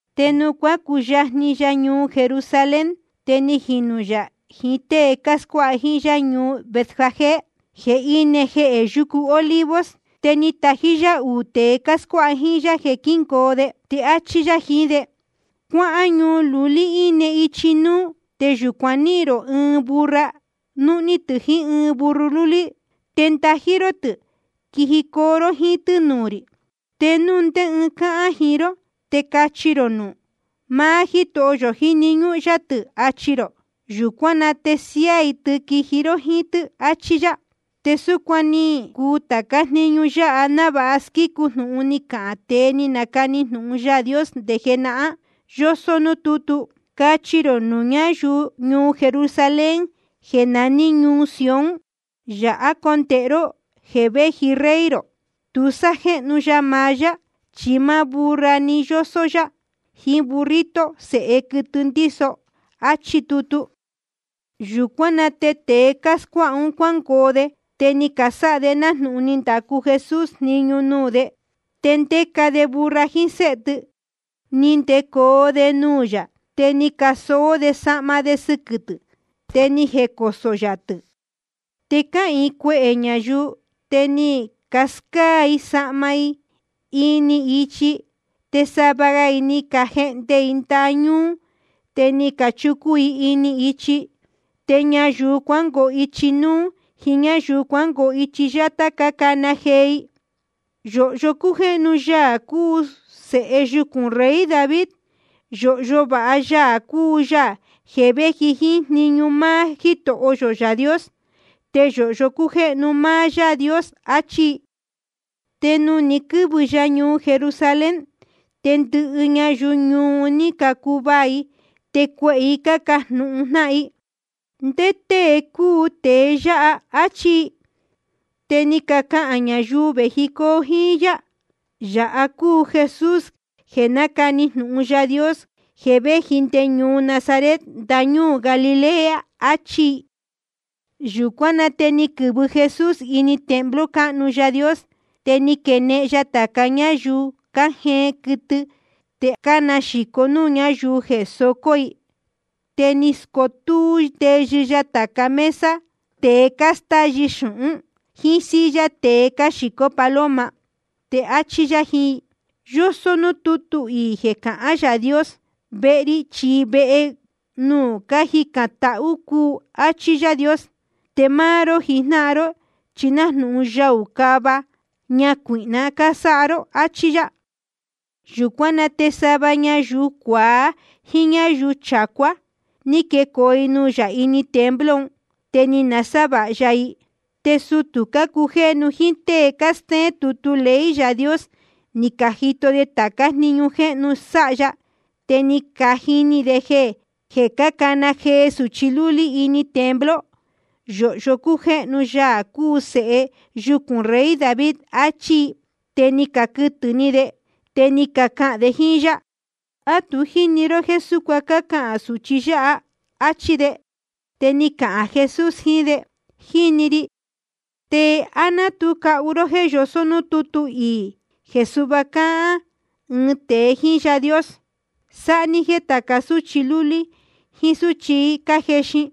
Te nuū cuácuyajni ya ñuu Jerusalén, te ni jinū yā jiín tée cáscuáha jíín yá ñuu Betfagé, jeē íne jehē yucu Olivos. Te ni tají yá uū tēe cáscuáha jíín yá jeē quíngoo de. Te áchí yá jiín de: Cuáhán ñuu lulí íne ichi núú. Te yūcuan níhīn rō ɨɨn burra, núhní tɨ̄ jiín ɨɨn burro lúlí. Te ndají ró tɨ̄, quijicoo ró jíín tɨ́ nuū rī. Te núu ndé ɨɨn cahān jiín ró, te cachi rō nuū: Máá Jítoho yō jíni ñúhún yá tɨ̄, achi rō. Yūcuán na te siáá‑ni i tɨ, quiji ró jíín tɨ́, achí yá. Te súcuan ni cuu tācá jniñu yáha návāha squícu jnūhun ni cahān tēe ni nacani jnūhun Yaā Dios nde jenahán, yósó núū tútu: Cachi rō nuū ñáyuu ñuu Jerusalén jeē naní ñuu Sión: Yāhá condēhe ró jeē véji Rey rō. Tu sájéhnu ya maá yá, chi máá burra‑ni yósó yá, jíín burrito, sēhe quɨtɨ ndíso. Achí tutu. Yūcuán na te tēe cáscuáha un cuángoo de, te ni casáha de nájnūhun ni ndacu Jesús jniñu nuū de. Te ndéca de burra jíín séhe tɨ, ni ndecoo de nuū yā. Te ni casoó de sahma de sɨquɨ̄ tɨ̄, te ni jecosō yā tɨ̄. Te cáhīin cuehē ñayuu, te ni cascáá i sahma i ini ichi. Te sava ga i ni cajehnde ndaha ñúú, te ni cachucun i ini ichi. Te ñayuu cuangoo ichi núú jíín ñáyuu cuangoo ichi yátá, cácana jee i: Yōhyo cújéhnu Yaā cúu Sēhe yucūn rey David. Yōhyo vāha Yaā cúu Yaā jeē véji jíín jniñu máá Jítoho yō Yaā Dios. Te yōhyo cújéhnu máá Yaā Dios. Achí i. Te nuū ni quɨ́vɨ ya ñuu Jerusalén, te ndɨhɨ ñayuu ñuu un ní cacuvaā i, te cuehē i cájnūhun jnáhan: ¿Ndé tée cúu tēe yáha? áchí i. Te ni cacahān ñayuu vējicoo jíín yá: Yāha cúu Jesús jeē nácani jnūhun Yaā Dios, jeē véji nde ñuu Nazaret ndañúū Galilea. Achí i. Yūcuán na te ni quɨ̄vɨ Jesús ini templo cáhnu Yaā Dios. Te ni quenehen ya tāca ñáyuu cájeen quɨtɨ te cánaxīco núū ñáyuu jeē socō i. Te ni scotúú ndeyɨ ya tāca mesa tēe cástáyɨ xūhún, jíín silla tēe cáxīcó paloma. Te áchí yá jiín i: Yósó núū tútu iī jeē cahán Yaā Dios: Vehe ri chi vehe nuū cájicān tahú cúu, áchí Yaā Dios. Te máá ró jijnáhan ró, chi nájnūhun yaū cava ñacuīhná ni canasáha ró. Achí yá. Yūcuán na te sava ñayuu cuaá jíín ñáyuu chacuá ni quecoo i nuū yā ini templo un. Te ni nasávāha ya i. Te sutū cácujéhnu jíín tée cástéén tutu ley Yaā Dios, ni cajito de tācá jniñu jéhnu sáha ya, te ni cajini de jeē cácana jee sūchi lúlí ini templo: Yōhyo cújéhnu Yaā cúu Sēhe yucūn rey David, achí i. Te ni caquɨtɨ̄ ni de. Te ni cacahān de jíín yá: ¿A tu jíni ró jéē súcuan cácahān sūchi yáha? áchí de. Te ni cahān Jesús jiín de: Jíni ri. ¿Te á ná tu cahu ró jéē yosó núū tútu iī jeē suhva cáhán ɨɨn tēe jíín Yaā Dios? Sáha ní jéē tāca súchi lúlí jíín súchi cájexin,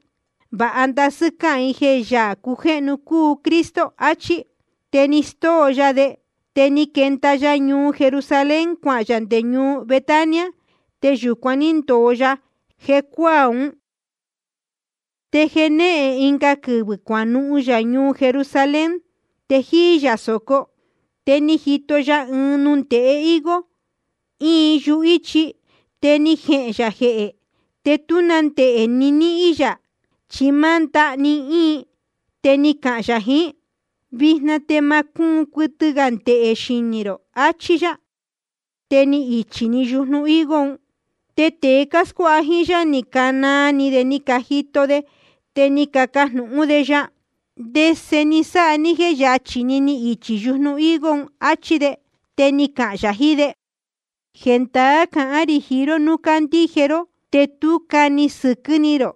vāha ndasɨ́ cáhán i jeē Yaā cujéhnu cúu Cristo. Achí. Te ni stóo ya de. Te ni quenda ya ñuu Jerusalén, cuahān yā nde ñuu Betania. Te yūcuan ní ndōo ya jecuáā ún. Te jenéhen ɨnga quɨvɨ̄ cuanuhun yā ñuu Jerusalén, te jíí yā sōco. Te ni jito ya ɨɨn nundēhe higo, íin yuhíchi. Te ni jehēn yā jehē. Te tú na ndehē ni níhín yā, chi máá ndaha‑ni íin. Te ni cahān yā jiín: Vijna te ma cúun cuɨtɨ gā ndehē xinī rō, achí yá. Te ni ichī‑ni yujnu higo ún. Te tēe cáscuáha jíín yá, ni canaa ni de cájito de. Te ni cacajnūhún de ya: ¿Ndese ni sáha ní jéē yachí‑ni ni ichī yujnu higo? achí de. Te ni cahān yā jiín de: Jendaá cahán rī jiín ró, núu candíje ró te tú cani sɨquɨ́ ni rō,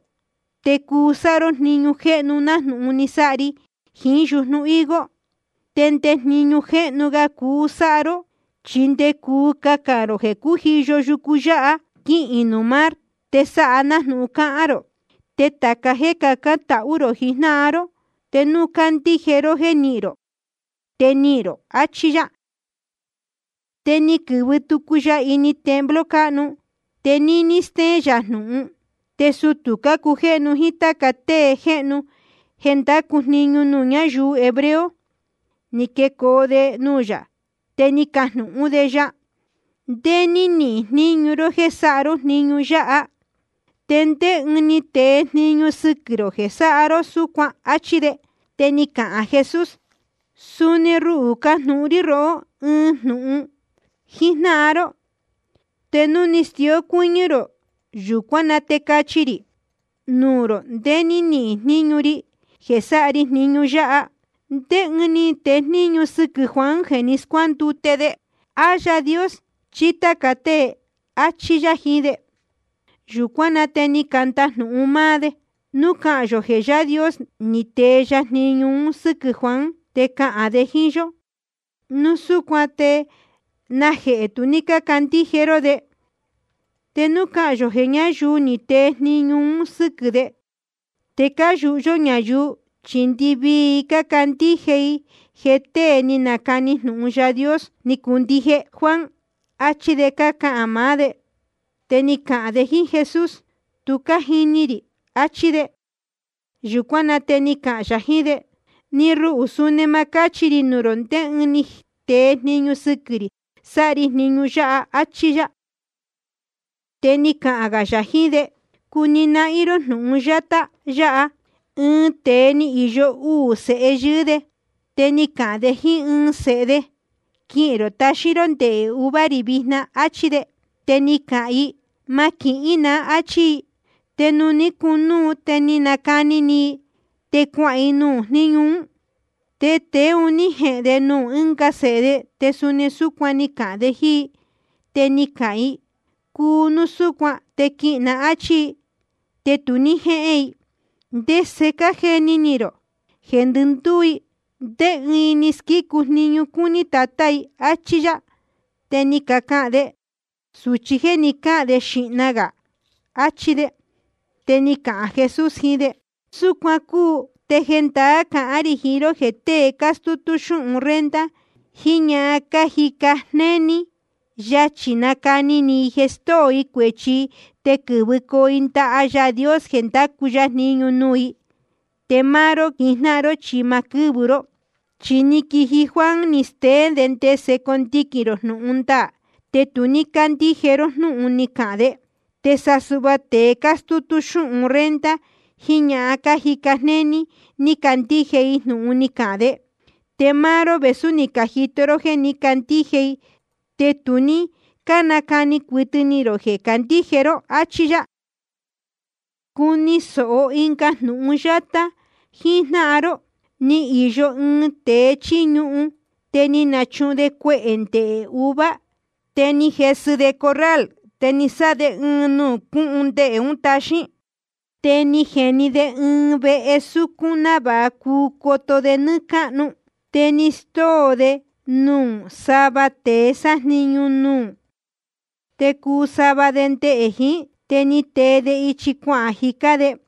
te cuu sáha ró jniñu jéhnu nájnūhun ni sáha ri jiín yujnu higo. Te nde jniñu jéhnu ga cuu sáha ró, chi nde cuu cahān rō jeē cújiyo yucu yáha, quihīn nuū mar, te sáha nájnūhun cahān rō. Te tāca jéē cacán tahú rō jijnáhan ró, te núu candíje ró jéē nihín rō, te nihīn rō. Achí yá. Te ni quɨ̄vɨ tucu ya ini templo cáhnu. Te níní stéén yā jnūhun, te sutū cácujéhnu jíín táca tée jéhnu jeē cándacu jniñu nuū ñáyuu hebreo, ni quecoo de nuū yā. Te ni cacajnūhún de ya: ¿Ndé ní nihīn jníñu ró jéē sáha ró jniñu yáha? ¿Te ndé ɨɨn ni tee jniñu sɨquɨ̄ rō jeē sáha ró súcuan? Achí de. Te ni cahān Jesús: Suni ruhū, cajnūhun rí rohó ɨɨn jnūhun jíjnáhan ró, te núu cuu stíó cuɨ́ñɨ́ rō, yūcuán na te cachi rī nuū rō ndé ní nihīn jníñu ri jeē sáha ri jniñu yáha. ¿Ndé ɨɨn ni tee jniñu sɨquɨ̄ Juan jeē ni scuándute de? ¿A Yaā Dios chí táca tée? áchí yá jiín de. Yūcuán na te ni candajnūhun máá de: Núu cahān yō jeē Yaā Dios ni tee ya jniñu un sɨ́quɨ̄ Juan, te cahān de jíín yó: Núu súcuan ¿te najehē tu ní cácandíje ró de? Te núu cahān yō jeē ñáyuu ni catee jniñu un sɨ́quɨ̄ de, te cáyūhu yó ñayuu, chi ndɨvii i cácandíje i jeē tée ni nacani jnūhun Yaā Dios ni cuu ndije Juan. Achí de cácahān maá de. Te ni cacahān de jíín Jesús: Tu cájini rī, achí de. Yūcuán na te ni cahān yā jiín de: Ni ruhū, suni ma cáchi rī nuū rō ndé ɨɨn ni tee jniñu sɨquɨ̄ rī sáha ri jniñu yáha, áchí yá. Te ni cahān gā yā jiín de: Cuni nahín ró jnūhun yátá yáha: Ɨɨn tēe ni īyo uū sēhe yɨɨ́ de. Te ni cahān de jíín ɨɨn i: Séhē, quihīn rō taxín ró ndehē uva rī vijna, áchí de. Te ni cahān i: Ma quihín na, áchí i. Te ni cunúu, te ni nacani ni i, te cuahān i nuū jníñu ún. Te tēe un ní jehēn de nuū ɨ́nga sēhe de, te suni súcuan ni cahān de jíín i. Te ni cahān i: Cuu núu súcuan, te quihīn na, áchí i. Te tu ní jéhén i. ¿Te ndese cájeni ni rō? Jeē ndɨndúú i, ¿ndé ɨɨn i ni squícu jniñu cúní tatá i? áchí yá. Te ni cacahān de: Sūchi jéē ni cáhān de jíín xíhna gā, achí de. Te ni cahān Jesús jiín de: Súcuan cúu, te jendaá cahán rī jiín ró jeē tée cástútú xúhun renta jiín ñahan cájica jnéní, yachī cánacani ni i jeē stóo i cuēchi i te quɨ́vɨcoo i ndaha Yaā Dios jeē ndacu ya jniñu nuū i, te máá ró jijnáhan ró chi ma quɨ́vɨ ró. Chi ni quiji Juan, ni steén de ndese condiquīn rō jnūhun ndaā, te tu ní cácandíje ró jnúhun ni cahān de. Te sa suhva tēe cástútú xúhun renta jiín ñahan cájica jnéní, ni cacandíje i jnūhun ni cahān de. Te máá ró, vēsú ni cajito ró jéē ní cacandíje i, te tu ní cánacani cuɨtɨ ni rō jeē candíje ró. Achí yá. ’Cuni sōho ɨnga jnūhun yátá jíjnáhan ró: Ni īyo ɨɨn tēe chíí ñuhun. Te ni nachuhun de cuehē ndehē uva. Te ni jesɨ de corral, te ni sáha de ɨɨn nuū cúhun ndehē un táxīn. Te ni jeni de ɨɨn vehe súcún návāha cuu coto de nɨ́ɨ́ cáhnu. ’Te ni stóo de nuū sava tēe sájniñu nuū, te cuu sava de ndehē jiín. Te ni tee de ichi cuahān jicá de.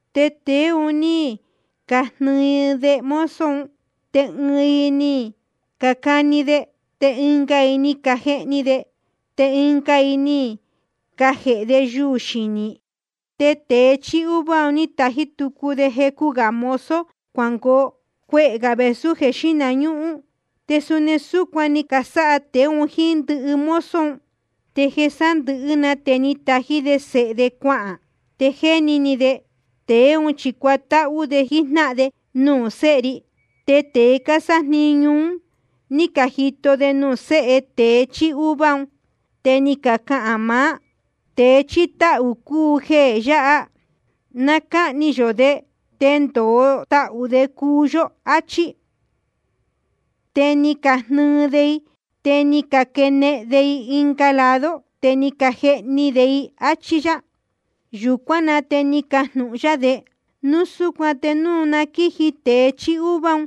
Te tēe un ní cajnɨɨ de mozo un. Te ɨɨn i ni cacani de, te ɨnga i ni cajehni de, te ɨnga i ni cajēhe de yuū xinī. Te tēe chíí uva ni tají tucu de jecu gā mozo cuangoo, cuehē gā vēsú jeē xíhna ñúhún. Te suni súcuan ni casáha tēe un jíín ndɨhɨ mozo un. ’Te jeē sándɨ̄hɨ́ na te ni tají de sēhe de cuahān. Te jéni ni de: Tēe ún chi cuatáhú de jíjnáhan de nuū séhe ri. Te tēe cásájniñu ún, núu ní cajito de nuū séhe tēe chíí uva, te ni cacahān maá: Tēe chíí táhū cúu jeē yáha. Na cáhni yō de, te ndōo tahū de cuu yó, áchí. Te ni cajnɨɨ de i, te ni caquenehen de i ɨnga lado, te ni cajehni de i. Achí yá. Yūcuán na te ni cajnūhun yá de: Núu súcuan te núu na quíji tēe chíí uva un,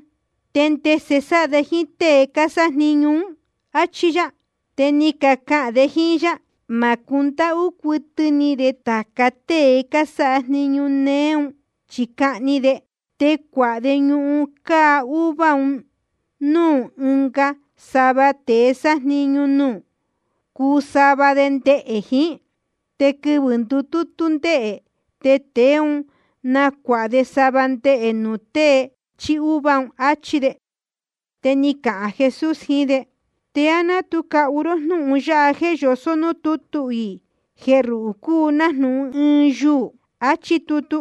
¿te ndese sáha de jíín tée cásájniñu ún? áchí yá. Te ni cacahān de jíín yá: Ma cundáhú cuɨtɨ ni de tāca tée cásáha jniñu néé un, chi cahni de. Te cuāha de ñuhun cáá uva un núū ɨnga sava tēe sájniñu nuū, cuu sava de ndehē jiín. Te quɨvɨ̄ ndutútú ndehē, te tēe ún nacuāha de sava ndehē nuū tée chíí uva. Achí de. Te ni cahān Jesús jiín de: ¿Te á ná tu cahu ró jnúhun yáha jeē yosó núū tútu iī, jeē ruhū cúu nájnūhun ɨɨn yuū? Chi áchí tutu: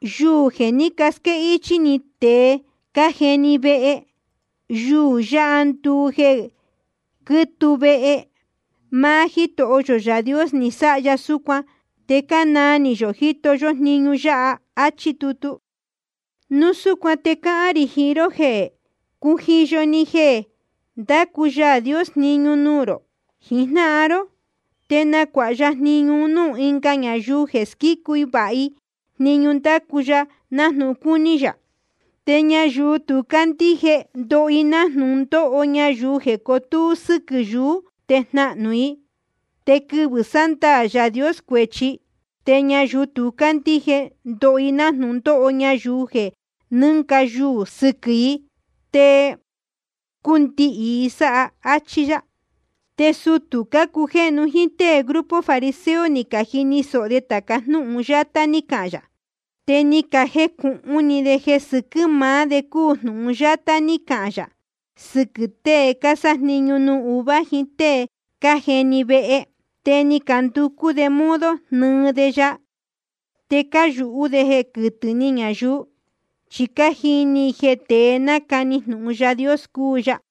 Yuū jeē ní casquéhichī tēe cájeni vehe, yuū yáha nduu jeē quítuu vehe. Máá Jítoho yō Yaā Dios ni sáha ya súcuan, te cánaa ni yō jíto yó jniñu yáha. Achí tutu. Núu súcuan te cáhán rī jiín ró jeē cujiyo‑ni jeē ndácu Yaā Dios jniñu nuū rō jijnáhan ró, te nacuāha ya jniñu un núū ɨnga ñayuu jeē squícu váha i jniñu ndácu ya nájnūhun cúní yā. Te ñayuu tu cácandíje, ndoho i nájnūhun ndóho ñayuu jeē cotúú sɨquɨ̄ yuú te jnáhnú i. Te quɨvɨ̄ sándaā Yaā Dios cuēchi, te ñayuu tu cácandíje, ndoho i nájnūhun ndóho ñayuu jeē nɨ́nga yuū sɨquɨ̄ i te cundihī i sáha. Achí yá. Te sutū cácujéhnu jíín tée grupo fariseo ni cajini sōho de tāca jnúhun yátá ní cahān yā. Te ni cajecūhun ni de jeē sɨquɨ̄ maá de cúu jnūhun yátá ní cahān yā sɨquɨ̄ tée cásájniñu nuū uva jiín tée cájeni vehe. Te ni canducú de modo jnɨɨ de ya. Te cáyūhú de jeē quɨtɨ̄ ni ñayuu, chi cájeni ni i jeē tée nácani jnūhun Yaā Dios cúu ya.